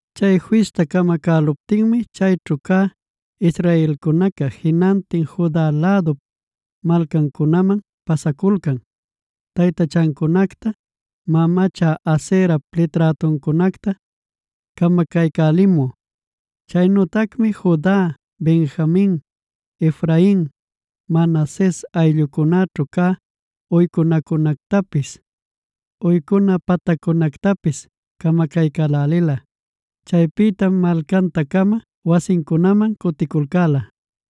Chay fista camacäluptinmi chayćhu cä israelcunaca jinantin Juda lädup malcancunaman pasaculcan taytachancunacta, mamacha Aserap liträtuncunacta camacaycälimü. Chaynütacmi Juda, Benjamin, Efrain, Manases ayllucunäćhu cä uycunacunactapis, uycuna pataccunactapis camacaycälälila. Chaypïtam malcanta-cama wasincunaman cuticulcäla.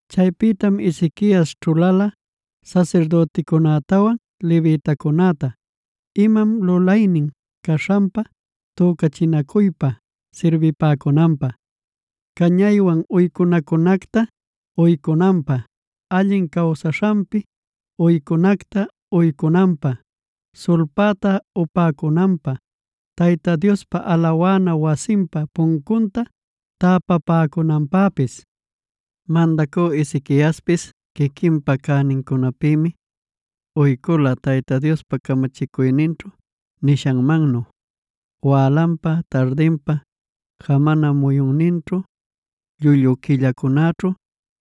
Chaypïtam Ezequias ćhulala sasirdüticunätawan levitacunäta imam lulaynin caśhanpa tücachinacuypa sirbipäcunanpä, cañaywan uycunacunacta uycunanpä, allin cawsaśhanpi uycunacta uycunanpä, sulpäta upäcunanpä, Tayta Diospa alawana wasinpa puncunta täpapäcunanpäpis. Mandacü Ezequiaspis quiquinpa cänincunapïmi uycula Tayta Diospa camachicuyninćhu nishanmannu wälanpa, tardinpa, jamana muyunninćhu, llullu quillacunaćhu,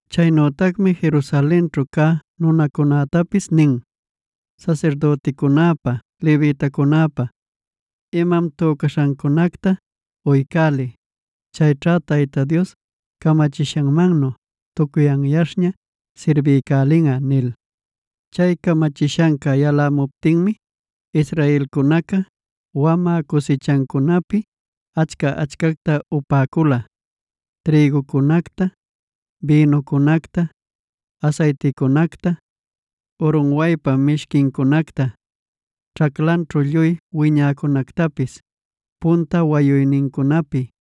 Chaynütacmi Jerusalenćhu cä nunacunätapis nin: “Sasirdüticunäpa levitacunäpa imam tücaśhancunacta uycäliy. Chayćha Tayta Dios camachishanmannu tucuy anyaśhña sirbiycälinꞌa” nil. Chay camachishanca yalämuptinmi israelcunaca wamä cusichancunapi achca-achcacta upäcula: trïgucunacta, bïnucunacta, asayticunacta, urunwaypa mishquincunacta, ćhaclanćhu lluy wiñäcunactapis punta wayuynincunapi.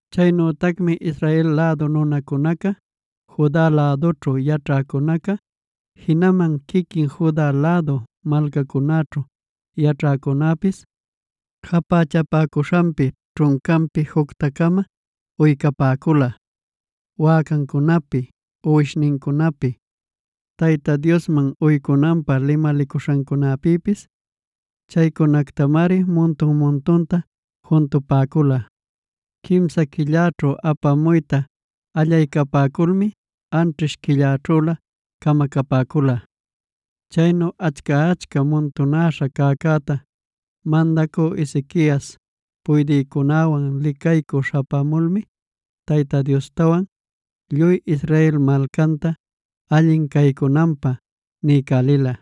Chaynütacmi Israel lädu nunacuna Juda lädućhu yaćhäcunaca, jinaman quiquin Juda lädu malcacunäćhu yaćhäcunäpis japächapäcuśhanpi, ćhuncapïta jucta-cama uycapäcula: wäcancunapi, uwishnincunapi, Tayta Diosman uycunanpä limalicuśhancunapïpis. Chaycunactamari muntun-muntunta juntupäcula. Quimsa quilläćhu apamuyta allaycapäculmi anćhish quilläćhülä camacapäcula. Chaynu achca-achca muntunäśha cäcäta, mandacü Ezequias puydïcunäwan licaycü śhapämulmi Tayta Diostawan lluy Israel malcanta allin caycunanpä niycälila.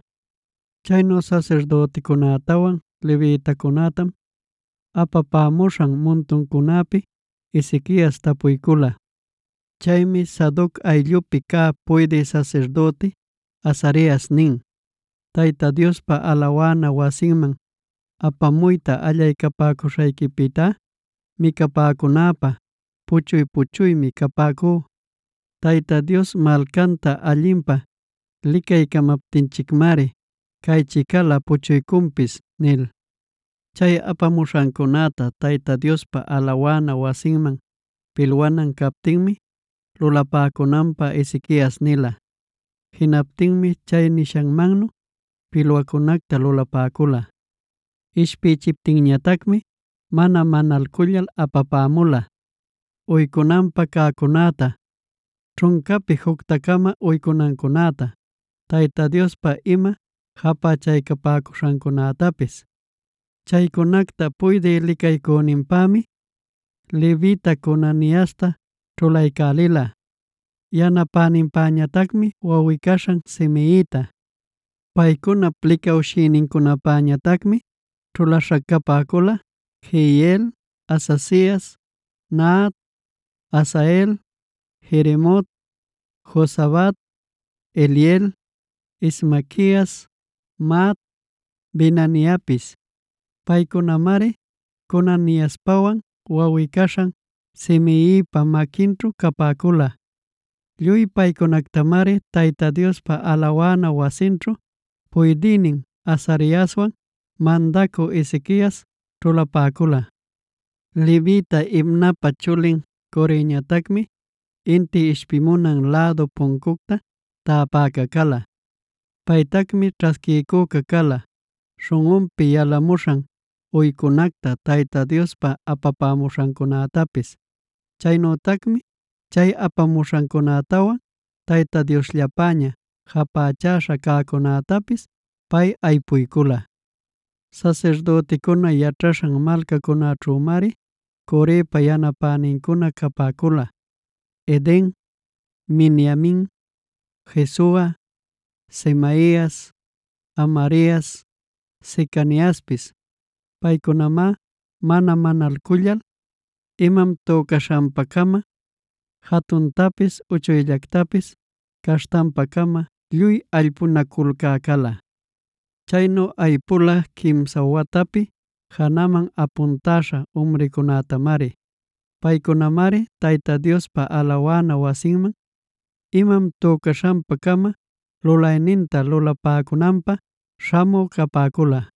Chayćhu sasirdüticunätawan levitacunätam apapämuśhan muntuncunäpi Ezequias tapuycula. Chaymi Sadoc ayllupi cä puydï sasirdüti Azarias nin: “Tayta Diospa alawana wasinman apamuyta allaycapäcuśhanpïtá micapäcunäpä puchuy-puchuymi capäcú. Tayta Dios malcanta allinpä licaycamaptinchicmari caychicalä puchuycunpis” nil. Chay apamuśhancunäta Tayta Diospa alawana wasinman pilwanan captinmi lulapäcunanpä Ezequias nila. Jinaptinmi chay nishanmannu pilwacunacta lulapäcula. Ishpïchiptinñatacmi mana manalcullal apapämula: uycunanpä cäcunäta, ćhuncapi jucta-cama uycunancunäta, Tayta Diospa ima japächaycapäcuśhancunätapis. Chaycunacta puydï licaycüninpämi levita Conaniasta ćhulaycälila, yanapäninpäñatacmi wawꞌi-caśhan Simeita. Paycunap licawshïnincunapäñatacmi ćhulaśha capäcula: Jehiel, Azazias, Nahat, Asael, Jerimot, Jozabad, Eliel, Ismaquias, Mahat, Benaiapis. Paycunamari Conaniaspawan wawꞌi-caśhan Simeipa maquinćhu capäcula. Lluy paycunactamari Tayta Diospa alawana wasinćhu puydïnin Azariaswan mandacü Ezequias ćhulapäcula. Levita Imnapa chulin Coreñatacmi inti ishpimunan lädu puncucta täpäca cala. Paytacmi ćhasquiycüca cala, śhunꞌunpi yalamuśhan uycunacta Tayta Diospa apamuśhancunätapis. Chaynütacmi chay apamuśhancunätawan Tayta Diosllapäña japächäśha cäcunätapis pay aypuycula. Sasirdüticuna yaćhaśhan malcacunäćhümari Corepa yanapänincuna capäcula: Eden, Miniamin, Jesua, Semaias, Amarias, Secaniaspis. Paycunamá mana manalcullal imam tücaśhanpa-cama jatuntapis uchuyllactapis caśhtanpa-cama lluy aypunaculcä cala. Chaynu aypula quimsa watapi janaman apuntäśha umricunätamari. Paycunamari Tayta Diospa alawana wasiman imam tücaśhanpa-cama lulayninta lulapäcunanpä śhamü capäcula.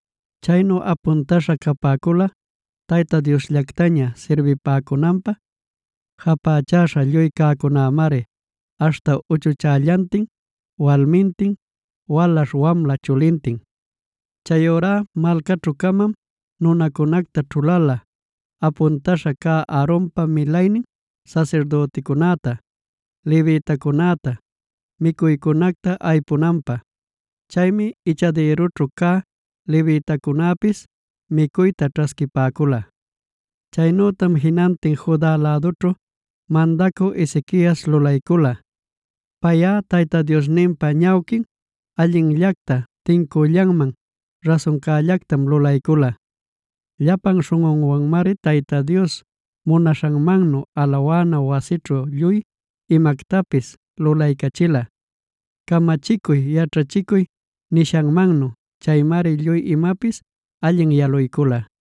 Chaynu apuntäśha capäcula Tayta Diosllactaña sirbipäcunanpä japächäśha lluy cäcunämari aśhta uchuchällantin, walmintin, walaśh wamla chulintin. Chayurá malcaćhu-camam nunacunacta ćhulala apuntäśha cä Aaronpa milaynin sasirdüticunäta, levitacunäta micuycunacta aypunanpä. Chaymi ichadïrunćhu cä levitacunäpis micuyta ćhasquipäcula. Chaynütam jinantin Juda lädućhu mandacü Ezequias lulaycula. Payꞌa Tayta Diosninpa ñawquin allinllacta, tincüllanman, rasuncällactam lulaycula. Llapan śhunꞌunwanmari Tayta Dios munaśhanmannu alawana wasićhu lluy imactapis lulaycachila camachicuy, yaćhachicuy nishanmannu. Chaymari lluy imapis allin yaluycula.